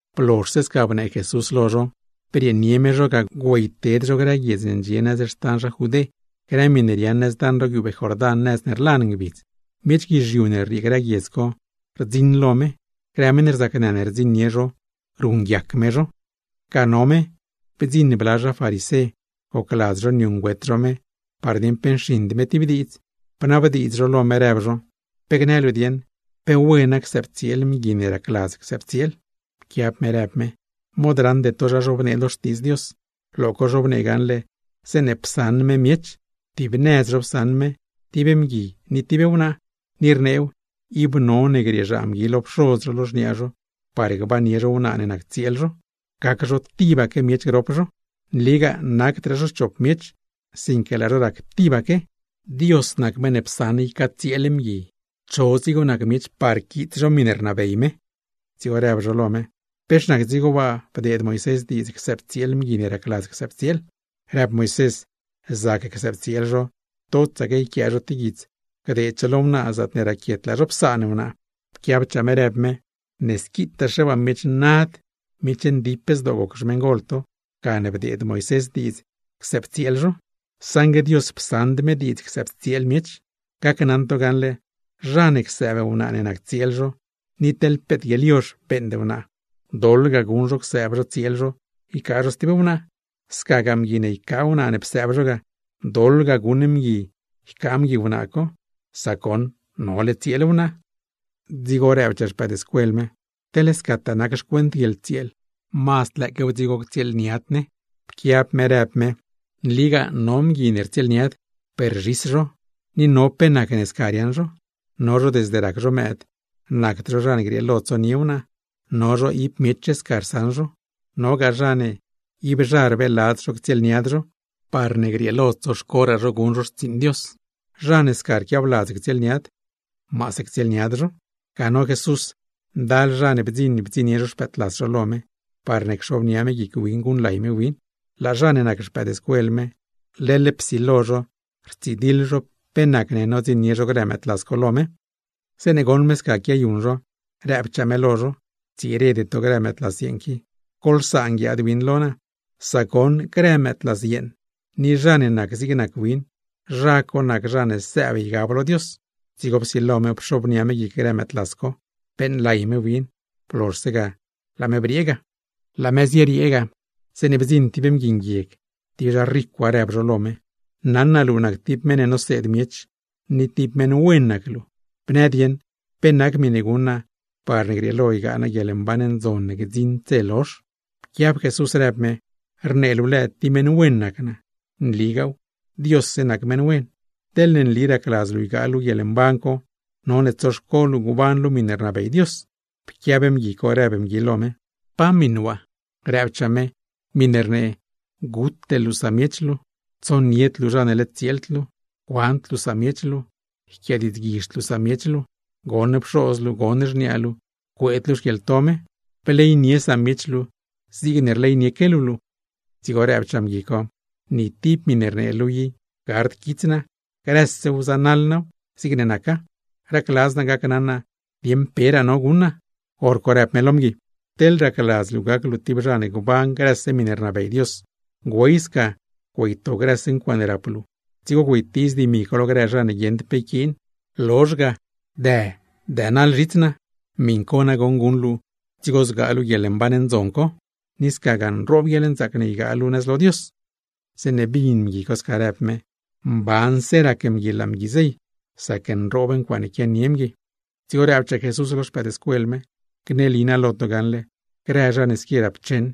Blozhse sca bnee Jesús lo zho, brieenie me zho ga güeyted zho grë guiedz ne ndxie xtan zha Judé, grë miṉe riaaṉ nëz daṉ ro guiubee Jordán, nëz ne rlan ngbidz. Miech guizhiu ne rriee grë guiedz co, rdziṉ lo me; grë meṉ rzacnë ne rdziṉnie zho, beeṉguiac me zho. Ga no me, bdziṉ bla zha farisé gocladz zho niuṉgüet zho me, par dieṉ pe nxiṉd me tib diidz; bnabdiidz zho lo me rëb zho: ―Pe gnë luu dieṉ, ¿pe wena csëbtsieel zha bgui ne gacladztaa csëbtsieel? Pquiab me rëb me: ―¿Mod raṉde to zha zhobnee lo Xtiidz Dios? Lo co zhobnee gaṉle zeeṉe psaṉ me miech, tib nëz zho psaṉ me, tib mgui ni tib wnaa. Ni rneew, ib none grieezhaa mgui lo pxoz zho, lo xniaa zho par gbannie zho wnaa ne nac tsieel zho, gac zho tibaque miech grop zho. Nligaa nacdraa zho chop miech, sinque laa zho rac tibaque. Dios nac meṉ ne psaṉ ycatsieel miech, cho dzigo nac miech par quiits zho miṉe rnabey me. Dzigo rëb zho lo me: ―¿Pex nac dzigo waa bdeed Moisés diidz csëbtsieel mgui ne racladz csëbtsieel? Rëb Moisés, zac csëbtsieel zho, totsaque yquia tib guits gdeed zho lo wnaa zaatne raquiet laa zho psaan wnaa. Pquiabchaa me rëb me: ―Ne squitaaxe waa miech nad, miech ndip zdoo goc xmeṉgol to, gane bdeed Moisés diidz csëbtsieel zho; saṉgue Dios psaṉd me diidz csëbtsieel miech. Gacnaṉ to gaṉle, zha ne csëëb wnaa ne nac tsieel zho, ni teḻ peet guieḻyozh beeṉd wnaa co, doḻ ga guṉ zho csëëb zho tsieel zho ycaa zho stib wnaa. Scaquegaa mgui ne ycaa wnaa ne psëëb zho ga, doḻ ga guṉ zho sac goṉ no tsieel wnaa co. Dzigo rëbchaa xpëëdscuel me: ―Teḻ scataa nac xcuent guieḻtsieel, mazd lëëquew dzigo ctsieelniad ne. Pquiab me rëb me: ―Nligaa no mgui ne rtsieelniad, per zhis zho, ni no pe nacne sca riaaṉ zho. No zho desde rac zho mëëd, nacd zho zha ne grieelo tsonie wnaa; no zho ib miech sca rsaṉ zho. Nogaa zha ne ib zha rbeeladz zho ctsieelniad zho, parne grieelo tsoxcoraa zho guṉ zho xtsiiṉ Dios. Zha ne sca rquiabladz ctsieelniad, maase ctsieelniad zho. Ga no Jesús, ndal zha ne bdziṉ bdziṉnie zho xpëëdlas zho lo me, parne cxobnia me guic win guṉlay me win. Grë zha ne nac xpëëdscuel me, leḻ psilo zho rtsidiḻ zho pe nacne nodziṉnie zho grë mëëdlas co lo me. Zeeṉe goṉ me sca quiayuṉ zho, rëbchaa me lo zho: ―Ctsirede to grë mëëdlas yeeṉ qui, goḻsaan guiaad win lo naa. Sac goṉ grë mëëdlas yeeṉ, ni zha ne nac zig nac win, zha co nac zha ne sëëb ygab lo Dios. Dzigo psilo me pxobnia me guic grë mëëdlas yeeṉ co, beeṉlay me win. Blozhse ga, laa me briee ga. Laa me zieriee ga, zeeṉe bdziṉ tib mgui nguieg, tib zha ricwa, rëb zho lo me: ―Naṉ naa luu nac tib meṉ ne noseed miech, ni tib meṉ wen nac luu. Bnë dieṉ, ¿pe nac miṉe guṉ naa parne grieelo ygaa naa guieḻmban ndzon ne gdziṉd dze lozh? Pquiab Jesús rëb me: ―Rnee luu lëë tib meṉ wen nac naa. ¡Nligaaw, Diosse nac meṉ wen! Teḻne nli racladz luu ygaa luu guieḻmban co, none tsoxco luu gban luu miṉe rnabey Dios. Pquiab zho rëb zho lo me: ―¿Pa miṉ waa? Rëbchaa me: ―Miṉe rnee: Gute luu samiech luu, teḻne nole tsieel luu, tsonied luu zha ne led tsieeld luu, cuand luu samiech luu, yquiadiidzguizhd luu samiech luu, goṉ pxoz luu, goṉ xniaa luu, cueed luu xquieḻto me. Bleynie samiech luu, zigne rleynie luu luu. Dzigo rëbchaa zho: ―Ni tib miṉe rnee luu i gard quits naa, grësew zanaḻ naaw zigne naca. Racladz naa gacnaṉ naa, dieṉ peraa no guṉ naa. Horco rëb me lo zho: ―Teḻ racladz luu gac luu tib zha ne gban grëse miṉe rnabey Dios, güey sca güeyto grëse ncuaaṉe rap luu, dzigo güeytiiz dimi co lo grë zha ne guieṉd pe yquiin. Lozh ga, dë dënaḻ zhits naa. Miṉ co nagoṉ guṉ luu, dzigo zgaa luu guieḻmban ndzon co; ni scagaa nroob guieḻnzaac ne ygaa luu nëz lo Dios. Zeeṉe bin zho sca rëb me, mbanse rac zho laa zho zey, sac nroob ncuaaṉe quianie zho. Dzigo rëbchaa Jesús lo xpëëdscuel me: ―Gneli naa lo to gaṉle, grë zha ne squi rapcheṉ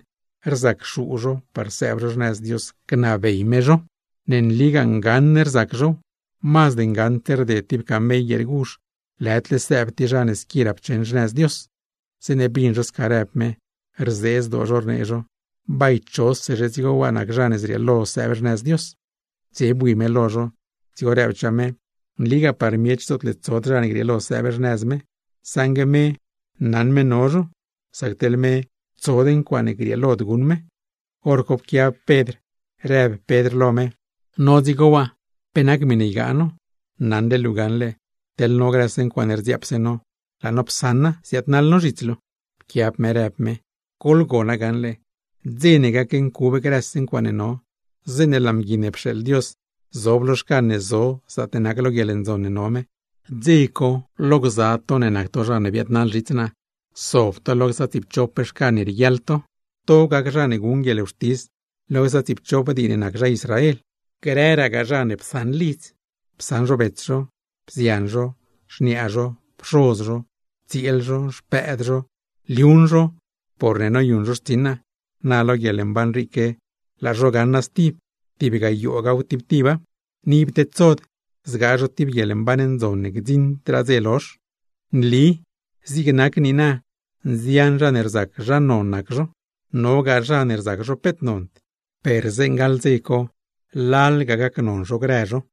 rzacxuu zho par sëëb zho xnëz Dios gnabey me zho. ¡Ne nligaa ngaṉ rzac zhow! Mazd ngaṉdse rded tib camell guieer guzh lëdle sëëb tib zha ne squi rapcheṉ xnëz Dios. Zeeṉe bin zho sca rëb me, rzee zdoo zho, rnee zho: ―Bay, ¿chosezhe dzigo waa nac zha ne zrieelo sëëb xnëz Dios? Dze bui me lo zho, dzigo rëbchaa me: ―Nligaa par miech zootle tsod zha ne grieelo sëëb xnëz me; saṉgue me naṉ me no zho. Sac teḻ me, tsod ncuaaṉe grieelod guṉ me. Horco pquiab Pedr rëb Pedr lo me: ―No dzigo waa, ¿pe nac miṉe ygaa no? Naṉle luu gaṉle, teḻ no grëse ncuaaṉe rdziaap no, laa no psaṉa, ziaadnaḻ no zhits luu. Pquiab me rëb me: ―Goḻgona gaṉle, dze ne gacncub grëse ncuaaṉe no, zeeṉe laa Mgui ne pxeeḻ Dios zob lo xcan ne zo zaatne nac lo guieḻndzon ne no me, dze co lo gza to ne nac to zha ne biaadnaḻ zhits naa, sob to lo gza tsiipchop xcan ne rieguiaḻ to. To gac zha ne guṉ guieḻwxtis lo gza tsiipchop dii ne nac zha Israel. Grëragaa zha ne psaṉ lidz, psaṉ zho bets zho, bzian zho, xniaa zho, pxoz zho, tsieel zho, xpëëd zho, liuṉ zho porne noyuṉ zho xtsiṉ naa, na lo guieḻmban riique laa zho gaṉa stib tib gayoogaw tib tiba; ni ib tedsod zgaa zho tib guieḻmban ndzon ne gdziṉdraa dze lozh. ’Nli zig nac niina, nzian zha ne rzac zha non nac zho, nogaa zha ne rzac zho peet nond, per zeeṉe gaḻ dze co lalga gac zho grë zho.